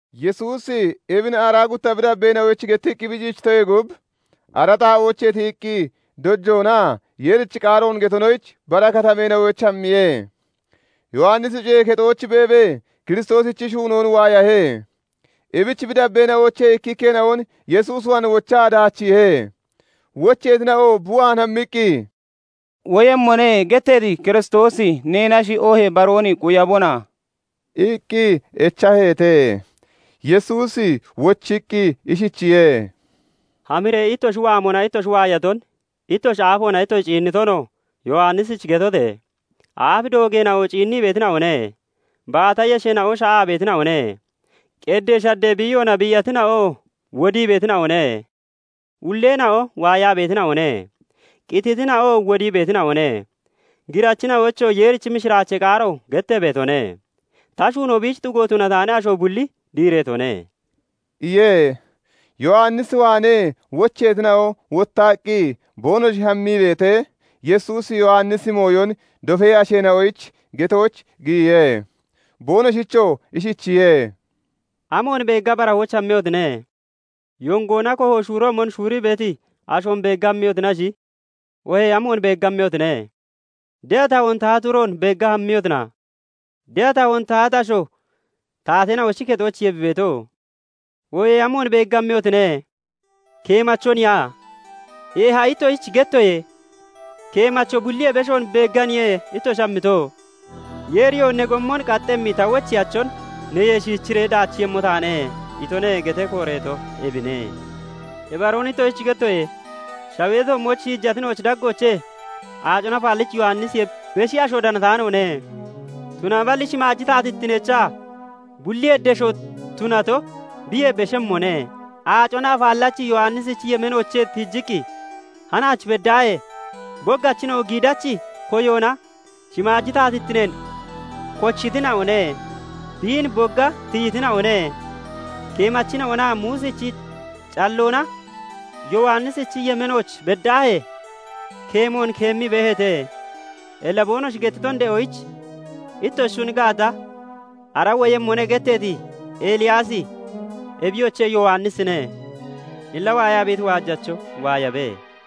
Yesuusi ebin aaraa gutta bi dabbeena'oyich gettiqqi bi ciichitoyee gub, ara xaa'oochee tiyiqqi dojoonaa Yeerichi qaaroon getonoyich bara katameena'ooch hammiye. Yowannisi cuyee kexooch beebee Kiristoosichi shuunoon waayahe; ebich bi dabbeena'oochee ikkikkeena'on Yesuus waan wochaa daachiihe. Wocheetina'oo bi waan hammiqqi, " 'Woyemmone' getteeti Kiristoosi neenashi, oohee baroon quyabona?" iqqi echaheete. Yesuusi wochiqqi ishichiye:- "Hamiree ittoshi waamona ittoshi waayaton, ittoshi aafoona ittoshi ciinnitonoo Yowannisich getote! Aaf doogeena'o ciinnii beetina'one; baata yesheena'oo sha'aa beetina'one; qeddee shaddee biiyoona biiyatina'oo wodii beetina'one; ulleena'oo waayaa beetina'one; qititina'oo wodii beetina'one; girachina'oyichoo Yeerichi mishiraachee qaaro gettee beetone. Ta shuunoo biich xugo tunataani asho bulli diireetone" iye. Yowannis waanee wocheetina'o wottaqqi boonoshi hammii beetee, Yesuusi Yowannisichi mooyon dofee asheena'oyich getooch giyiye; boonoshichoo ishichiye:- "Amoon beegga barahooch hammiyotine? Yongoona koho shuuroomon shuurii beeti ashoon beegga hammiyotinashi oohee amoon beegga hammiyotine? De'a tahoon tahati uroon beegga hammiyotina? De'a tahoon tahati asho taateena'ochi kexoochiye bi beeto. Oohee amoon beegga hammiyotine? Keemachoniya? Eeha, ittoshich gettoye; keemacho bulliyee beshoon beegganiye ittoshi hammito. " 'Yeeriyoo "Ne gommon qaxxemmi ta wocheyachon neyee shiichiree daachiiyemmo taane" itone' getee kooreeto ebine. Ibaroon ittoshich gettoye; shawee toommooch shiijatina'ochi daggoochee Aacona Afaallachi Yowannisiyee beshi asho danataanoone; tunaballi shimaaji taatittineechaa bulliyee desho tunato biyee beshemmone. Aacona Afaallachi Yowannisichi yemeenoochee tiijiqqi hanaach beddaahee boggachina'o giidachi koyoona shimaaji taatittineen kochitina'one; biin bogga tiyitina'one. Keemachina'onaa Muusichi calloona Yowannisichi yemeenooch beddaahee keemoon keemmii beeheete. Illa boonoshi gettiton de'oyich ittoshi shuni gaata, ara 'Woyemmone' getteeti Eliyaasi, ebiyoche! Yowannisine. Illa waayaa beeti waajacho waayabe.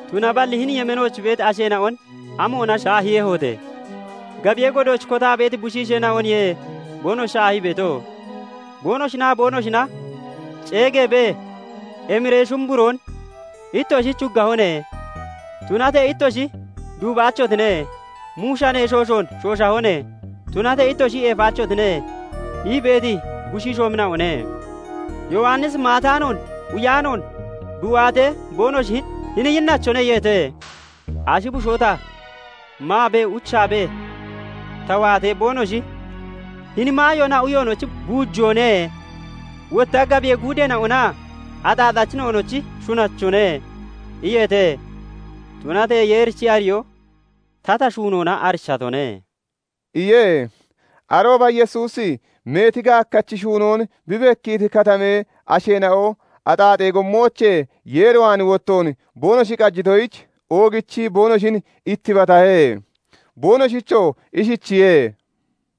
"Tunaballi hini yemeenooch beeti asheena'on amoona shaahiiyehote? Gabiyee godooch kotaa beeti bushiisheena'oniye boonoshi shaahii beeto; boonoshinaa boonoshina ceegeebee, 'Emiree shumburoon ittoshich huggahone; tunatee ittoshi duubaachotine; muushanee shooshoon shooshahone; tunatee ittoshi eefataachotine' ii beeti bushiishoomina'one. Yowannisi maataanoon, uyaanoon bi waatee, boonoshi 'Hini yinnachone!' iyeete. Ashi bushoo ta maabee, uchaabee ta waatee, boonoshi 'Hini maayoonaa uyoonochi buujoone; wotta gabiyee guudeena'onaa axaaxachina'onochi shunachone' iyeete. Tunatee Yeerichi ariyoo tata shuunoona arichatone" iye. Arooba Yesuusi meeti gaakkachi shuunoon bi bekkiiti katamee asheena'o axaaxee gommoochee Yeer waan wottoon boonoshi qajitoyich, oogichii boonoshin ittibatahe; boonoshichoo ishichiye:-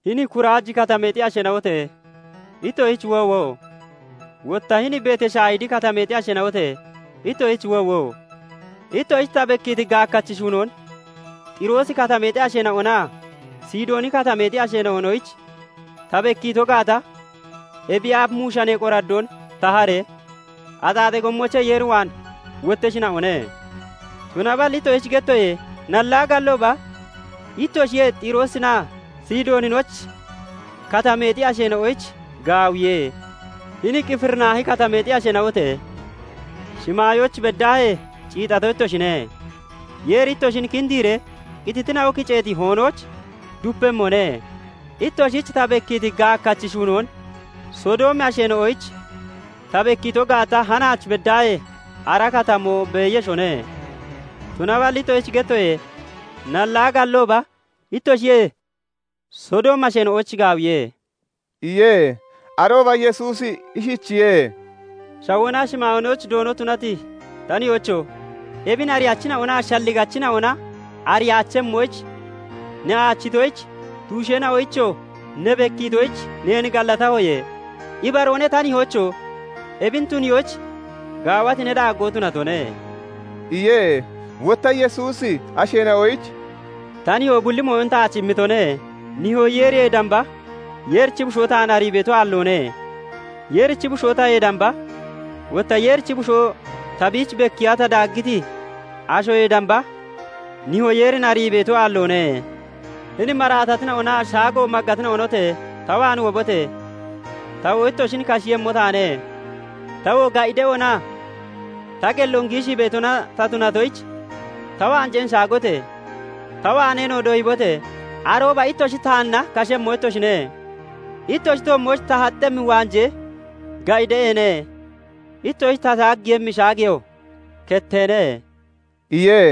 "Hini Kuraaji Katameexi asheena'ote! Ittoshich woowo! Wotta hini Betashayidi Katameexi asheena'ote! Ittoshich woowo! Ittoshich ta bekkiiti gaakkachi shuunoon Xiroosi Katameexi asheena'onaa Sidooni Katameexi asheena'onoyich ta bekkiito gaata, ebiyee aaf muushanee qoraddoon taharee, axaaxee gommoochee Yeer waan wotteshina'one. Tunaballi ittoshich gettoye; nallaa gallooba ittoshiyee Xiroosinaa Sidooninochi Katameexi asheena'onoyich gaawiye. Hini Qifirinaahi Katameexi asheena'ote! Shimaayooch beddaahee ciixato ittoshine; Yeeri ittoshin kindiiree qititina'o kiceeti hoonooch dupemmone. Ittoshich ta bekkiiti gaakkachi shuunoon Sodoomi asheena'oyich ta bekkiito gaata, hanaach beddaahee ara katamoo beeyeshone. Tunaballi ittoshich gettoye; nallaa gallooba ittoshiyee Sodoomi asheena'oyich gaawiye" iye. Arooba Yesuusi ishichiye:- "Shawoonaa shimaayoonochi Doono tunati ta nihoocho! Ebin ariyachina'onaa shalligachina'ona ariyaachemmoyich ne aachitoyich, tuusheena'oyichoo ne bekkiitoyich neen gallatahoye. Ibaroone, ta nihoocho! Ebin tuniyoyich gaawati ne daaggo tunatone" iye. Wotta Yesuusi asheena'oyich "Ta nihoo bulli mooyon taach immitone; nihoo Yeeriyee damba Yeerichi Bushoo taan arii beeto aalloone; Yeerichi Bushoo tayee damba, wotta Yeerichi Bushoo ta biich bekkiiya ta daaggiti ashoyee damba, nihoo Yeerin arii beeto aalloone. "Hini maraatatina'onaa shaago maggatina'onote! Ta waan wobote! Tawoo ittoshin kashiiyemmo taane. Tawoo ga'i de'oonaa ta qelloon giishii beetona ta tunatoyich, ta waanjeen shaagote! Ta waaneenoo doyibote! Arooba ittoshi taanna kashemmo ittoshine. Ittoshi toommooch ta haxxemmi waanjee ga'i de'eene; ittoshich ta shaaggiiyemmi shaageyoo ketteene" iye.